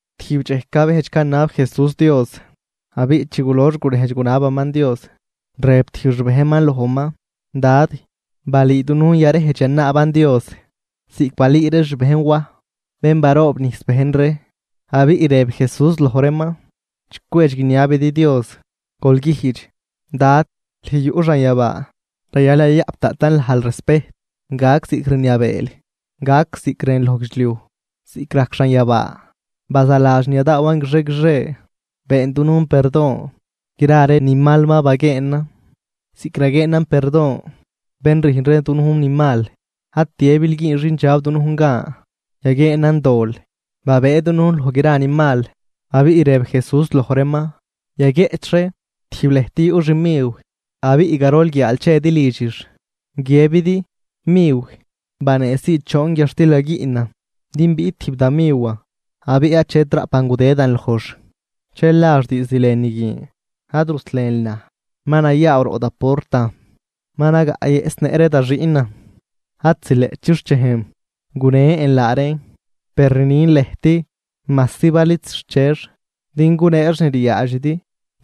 Tijb dxej cabejdx canab Jesús Dios. Abiꞌ chi gulox gurejdx gunabaman Dios, rëb tijb xbejnman lojman: ―Dad, balüü dunujn yarejdx yanaaban Dios, ziꞌc balüü ree xbejn Waj bén baroobnijs bejn ree. Abiꞌ rëb Jesús loj reeman: ―Chi cwedx guiniabidi Dios, gol güjdx: Dad, lüj yuꞌ xanyabaa, rayal yayaꞌp daꞌtan lajl respejt. Gac ziꞌc rniabeel. Gac ziꞌc rënl loj guidxliuj, ziꞌc rajc xanyabaa. Bazaladx ni yadaawan guixie guixie. Been dunujn perdon gra ree ni mal ma baguieenan, ziꞌc raguieenan perdon bén rüjn ree dunujn ni mal. Ad tiëbil güün xindxab dunujn gan yaguieenan dol, babëë dunujn loj gra ni mal. Abiꞌ rëb Jesús loj reeman: ―Yaguieꞌch ree, tijb lëjt yuꞌ xmiw abiꞌ garol guiaal chedi lidxix, guiëbidi: “Miw, baneesii choon guiadxtil gaguiꞌnan, din biꞌt tijb da miwan abiꞌ achet raꞌpan gudëdan lojx.” Dxel nax diizd lënü guin: “Ad ruslenl naj. Ma nayaaw roꞌ da portan. Ma nagaꞌyëꞌsnëꞌ ree da xiꞌnan. Ad zileꞌt chixchejn gunen laa reen.” Per rnin lëjt, majsi bal id zixchex din guneex ni ryaadxidi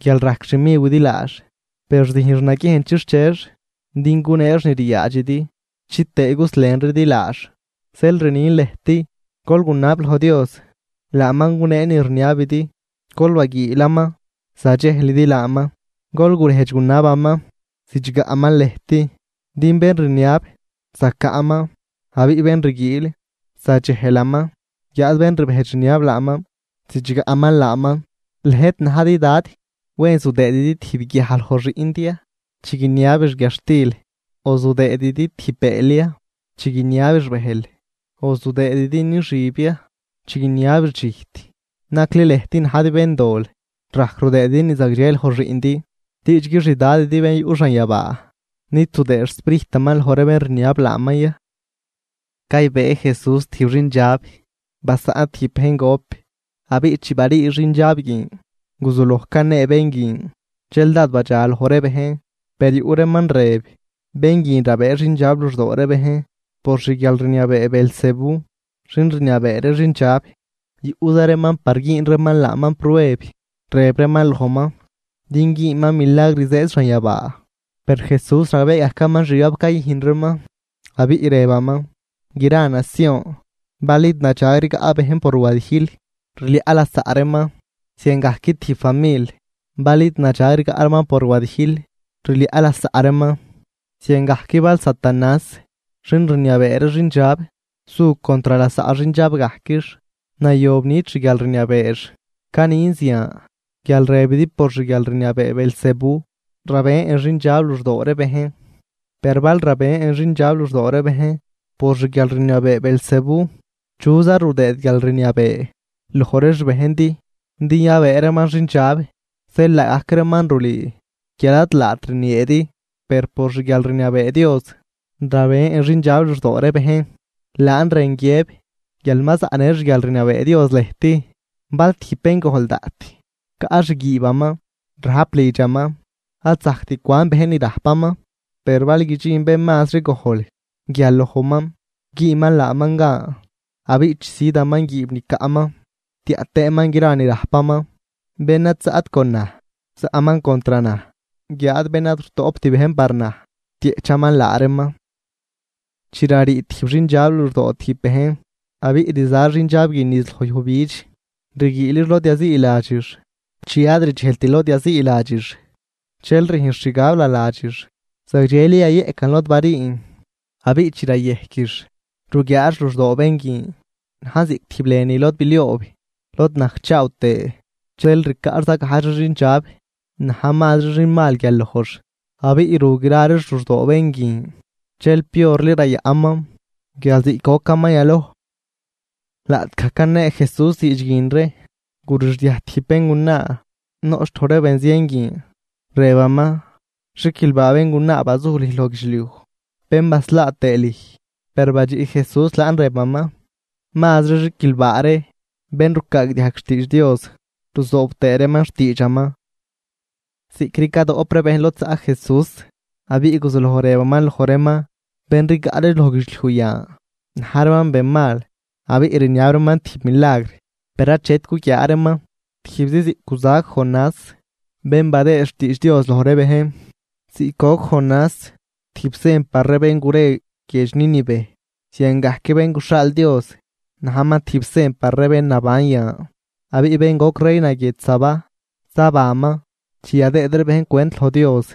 guial rajc xmiwidi laax. Per züjnx naguiejn chixchex din guneex ni ryaadxidi chitëë guslenridi laax. Zeel rnin lëjt: Gol gunab loj Dios, laaman gunee ni rniabidi. Gol baguiilaman, zadxejlidi laaman. Gol gurejdx gunabaman, zidxgaꞌman lëjt. Din bén rniab, zacaꞌman. Abiꞌ bén rguiil, zadxejlaman guiáad bén rbejdx rniab laaman zidxgaꞌman laaman. ’¿Lëjt najdi dad, wen zudëëdi tijb guiaj loj xiꞌndi ya chi guiniabix guiadxtil?, ¿o zudëëdi tijb bëël ya chi guiniabix bëjl? ¿O zudëëdi nixüb ya chi guiniabix dxijt? Nacli lëjt najdi béndol rajc rudëëdi ni zagdxe loj xiꞌndi. ¡Diidxgui xDadidi bén yuꞌ xanyabaa, nid zudëë xSprijtaman loj ree bén rniab laaman ya! Caybëë Jesús tijb xindxab basaꞌn tijb bejn gop. Abiꞌ chi barii xindxab guin guzuloj canee bén guin. Dxel dád badxaloj ree bejn. Per yuꞌ reeman rëb: ―Bén guin rabëë xindxab luxdoo ree bejn por xguialrniabee Beelzebú, xin rniabee ree xindxab. Yuꞌza reeman par güün reeman laaman prueb, rëb reeman lojman din güünman milagr zëëd xanyabaa. Per Jesús ragbee gajcaman xgab cayüjn reeman, abiꞌ rëbaman: ―Gra nacion bal id nadxag rigaꞌ bejn por wadijl, rliaꞌ lasaꞌ reeman, ziangajc tijb famil bal id nadxag rigaꞌ reeman por wadijl, rliaꞌ lasaꞌ reeman. Ziangajc bal Satanás xin rniabee ree xindxab su contr lasaꞌ xindxab gajquix, nayob nit xguialrniabeex. Canin zian guial rëbidi por xguialrniabee Beelzebú rabën xindxab luxdoo ree bejn. Per bal rabën xindxab luxdoo ree bejn por xguialrniabee Beelzebú, ¿chuza rudëëd guialrniabee loj ree xbejndi din yabëë reeman xindxab? Zeel laagajc reeman rulüü guial ad laat rnieedi. Per por xguialrniabee Dios rabën xindxab luxdoo ree bejn, laan rën guiëb guial ma zaꞌnë xguialrniabee Dios lëjt. ’Bal tijb béngojl daꞌt caꞌ xguiibaman, rajp lidxaman. Ad zajct cwan bejn ni rajpaman. Per bal guidxin bén mazri gojl guial lojman güünman laaman gan abiꞌ chisüdaman guiib ni caꞌman tiaꞌ tëëman gra ni rajpaman. ’Bén ad zaꞌt con naj, zaꞌman contr naj, guiáad bén ad rutoꞌpt bejn par naj rtieꞌchaman laa reeman. ’Chi rarii tijb xindxab luxdoo tijb bejn, abiꞌ rza xindxab guin niz loj yujbidx rguiilix lod yaziiladxix. Chi ad rdxejlt lod yaziiladxix, dxel rüjnx xgab naladxix: “Zagdxeli yayeꞌcan lod bariin.” Abiꞌ chi rayejquix ruguiaax luxdoo bén guin, najn ziꞌc tijb lënü lod bilioob lod najcchaaw tëë. Dxel ricaꞌx zagajdx ree xindxab na̱j mazri xinmal guial lojx. Abiꞌ ru gra reex luxdoo bén guin. Dxel piorli rayaꞌnman guial ziꞌc gocaman yaloj. Laꞌtgaj canee Jesús diidx guin ree, gurixdiaj tijb béngunaa noꞌch loj ree benzien guin, rëbaman: ―¡Xiquilbaa béngunaa bazuj lüj loj guidxliuj, bén baslaa tëë lüj! Per badxiꞌ Jesús laan rëbaman: ―¡Mazri xiquilbaa ree bén rucaagdiajg xtiidx Dios ruzoob tëë reeman xtiidxaman! Ziꞌcri cadoꞌp ree bejn lod zaꞌ Jesús, abiꞌ guzuloj rëbaman loj reeman: ―Bén rigaꞌ ree loj guidxliuj yan, na̱j reeman benmal. Abiꞌ rniab reeman tijb milagr, per achet guguiaa reeman, tijbzi ziꞌc guzac Jonás bén badëë xtiidx Dios loj ree bejn. Ziꞌc goc Jonás tijb sen par ree bén gure guiedx Nínive, ziangajc Bén guxhaal Dios najman tijb sen par ree bén naban yan. Abiꞌ bén goc reina guiedx Sabá, zabanman chi yadëëd ree bejn cwent loj Dios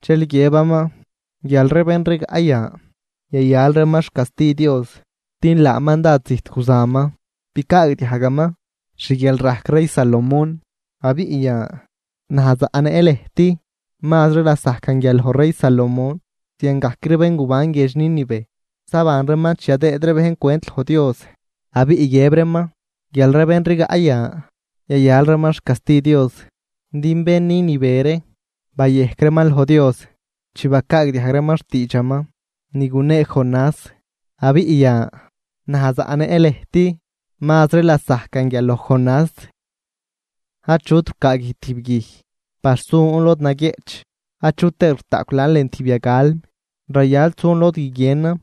dxel guiëbaman guial ree bén rigaꞌ yan, yayal reeman xcasti Dios. Din laaman dád zijt guzaman bicaagdiajgaman xguialrajc rey Salomón. Abiꞌ yan, naj zaꞌnëꞌn lëjt, mazri lasajcan guial loj rey Salomón. Ziangajc ree bén guban guiedx Nínive, zaban reeman chi yadëëd ree bejn cwent loj Dios abiꞌ guiëb reeman guial ree bén rigaꞌ yan, yayal reeman xcasti Dios. Din bén Nínive ree bayejc reeman loj Dios chi bacaagdiajg reeman xtiidxaman ni gunee Jonás. Abiꞌ yan, naj zaꞌnëꞌn lëjt mazri lasajcan guial loj Jonás. ’Achut rucaaguij tijb guij par sun lod naguieꞌch, achu tëët rutaꞌcw laan lën tijb yagalm. Rayal sun lod guiguienan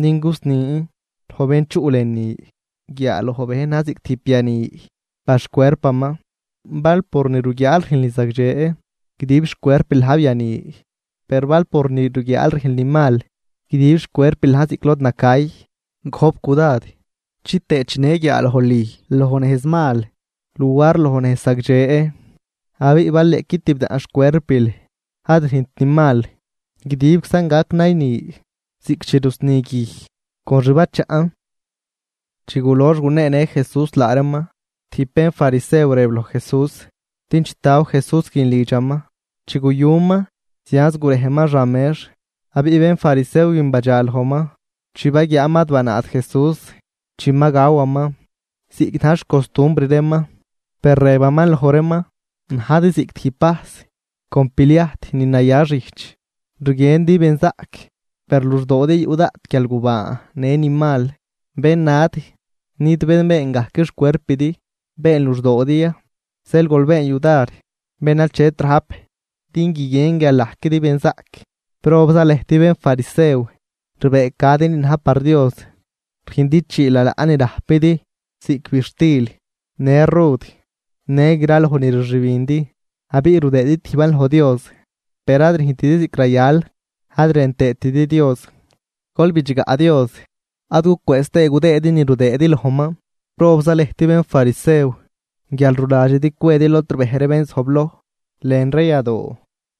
din gusnin loj bén chuꞌ lënü. Guiaaloj bejn na̱j ziꞌc tijb biani par xcuerpaman. Bal por ni ruguiaal rüjnl ni zagdxe, guidib xcuerpil na̱j biani. Per bal por ni ruguiaal rüjnl ni mal, guidib xcuerpil na̱j ziꞌc lod nacay. Gojp cudad chitëë chinë guiaalojl lüj loj nejz mal luar loj nejz zagdxe. Abiꞌ bal niꞌqui tibdaꞌn xcuerpil ad rüjnt ni mal, guidibczan gac nayni ziꞌc chi rusni guij con xbachaꞌn. Chi gulox guneenë Jesús laa reeman, tijb bénfarisew rëb loj Jesús din chitaw Jesús lidxaman. Chi guyuman, zianz gurejman xan mex. Abiꞌ bénfarisew guin badxalojman chi baguiaaman ad banaat Jesús chi ma gawaman ziꞌc na̱j xcostumbr reeman. Per rëbaman loj reeman: ―Najdi ziꞌc tijb vajs con pliajt ni naya xijch, rguiendi benzaꞌc, per luxdoodi yuꞌ daꞌt guialgubaan në ni mal. ¡Bennad! ¿Nid bén been gajc xcuerpidi been luxdoodi ya? Zeel gol been yudar bén achet rajp din guiguien guial najquidi benzaꞌc. ’¡Probza lëjt bénfarisew! Rbëëcadi ni na̱j par Dios, rüjndi chii lalaꞌ ni rajpidi ziꞌc bidxtil në rud në graloj ni rxübindi abiꞌ rudëëdi tijban loj Dios. Per ad rüjntidi ziꞌc rayal ad rën tëëtidi Dios. Gol bidxgaꞌ Dios ad gucwëëz tëë gudëëdi ni rudëëdi lojman. ’¡Probza lëjt, bénfarisew! guial ruladxidi cwedi lod rbej ree bén zojbloj lën ree yadoo,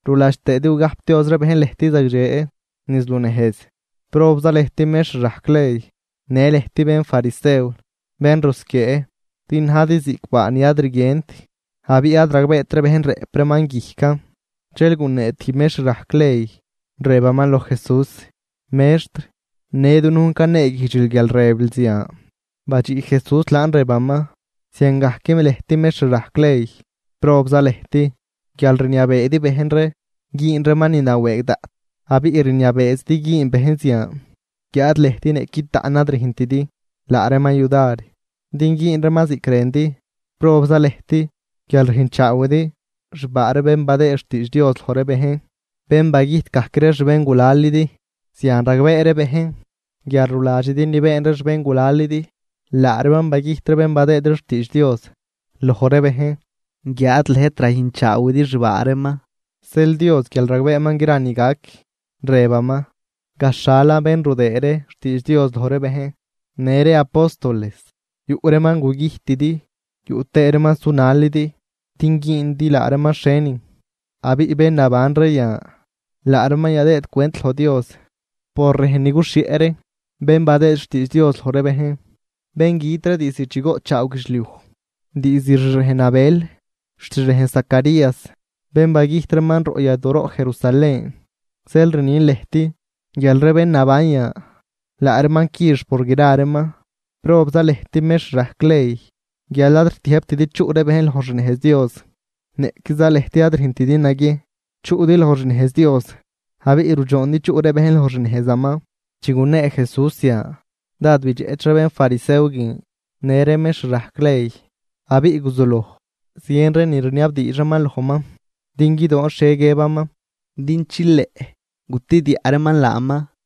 ruladx tëëdi gugajpdioz ree bejn lëjt zagdxe niz lunejz. ’¡Probza lëjt, mextr rajc ley në lëjt bénfarisew, bén rusquiee!, din najdi ziꞌc baa ni ad rguient, abiꞌ ad ragbeet ree bejn rëꞌp reeman guijcan. Dxel gunee tijb mextr rajc ley, rëbaman loj Jesús: ―Mextr, në dunujn caneeguijdxil guial rëbil zian. Badxiꞌ Jesús laan rëbaman: ―¡Ziangajc lëjt mextr rajc ley, probza lëjt!, guial rniabeedi bejn ree güün reeman ni nawëëgdaꞌt abiꞌ rniabeezidi güün bejn zian guiáad lëjt niꞌqui taꞌn ad rüjntidi laa reeman yudar din güün reeman ziꞌc rëndi. ’¡Probza lëjt!, guial rüjnchaawidi xbaa ree bén badëë xtiidx Dios loj ree bejn, bén bagüjt gajc ree xbéngulalidi. Zian ragbee ree bejn guial ruladxidi ni been ree xbéngulalidi. Laa reeman bagüjt ree bén badëë ree xtiidx Dios loj ree bejn, guiáad lëjt rayüjnchaawidi xbaa reeman. ’Zeel Dios guial ragbeeman gra ni gac, rëbaman: “Gaxhalan bén rudëë ree xtiidx Dios loj ree bejn, në ree apóstoles, yuꞌ reeman gugüjtidi yuꞌ tëë reeman sunalidi din güündi laa reeman xhienin.” Abiꞌ bén naban ree yan, laa reeman yadëëd cwent loj Dios por rejn ni guxhieꞌ ree bén badëë xtiidx Dios loj ree bejn, bén güt ree diizd chi goꞌtchaaw guidxliuj, diizd xrejn Abel xt xrejn Zacarías bén bagüjt reeman roꞌ yadooroꞌ Jerusalén. Zeel rnin lëjt guial ree bén naban yan, laa reeman quix por gra reeman. ’¡Probza lëjt, mextr rajc ley!, guial ad rtiëjbtidi chuꞌ ree bejn loj xnejz Dios, niꞌquiza lëjt ad rüjnt naguiejn chuꞌdi loj xnejz Dios abiꞌ rudxoondi chuꞌ ree bejn loj xnejzaman. Chi gunee Jesús zian, dád bidxeꞌch ree bénfarisew guin në ree mextr rajc ley. Abiꞌ guzuloj zien ree ni rniabdiidx reeman lojman, din guidoon xhie guiëbaman din chileꞌ gutediaꞌ reeman laaman.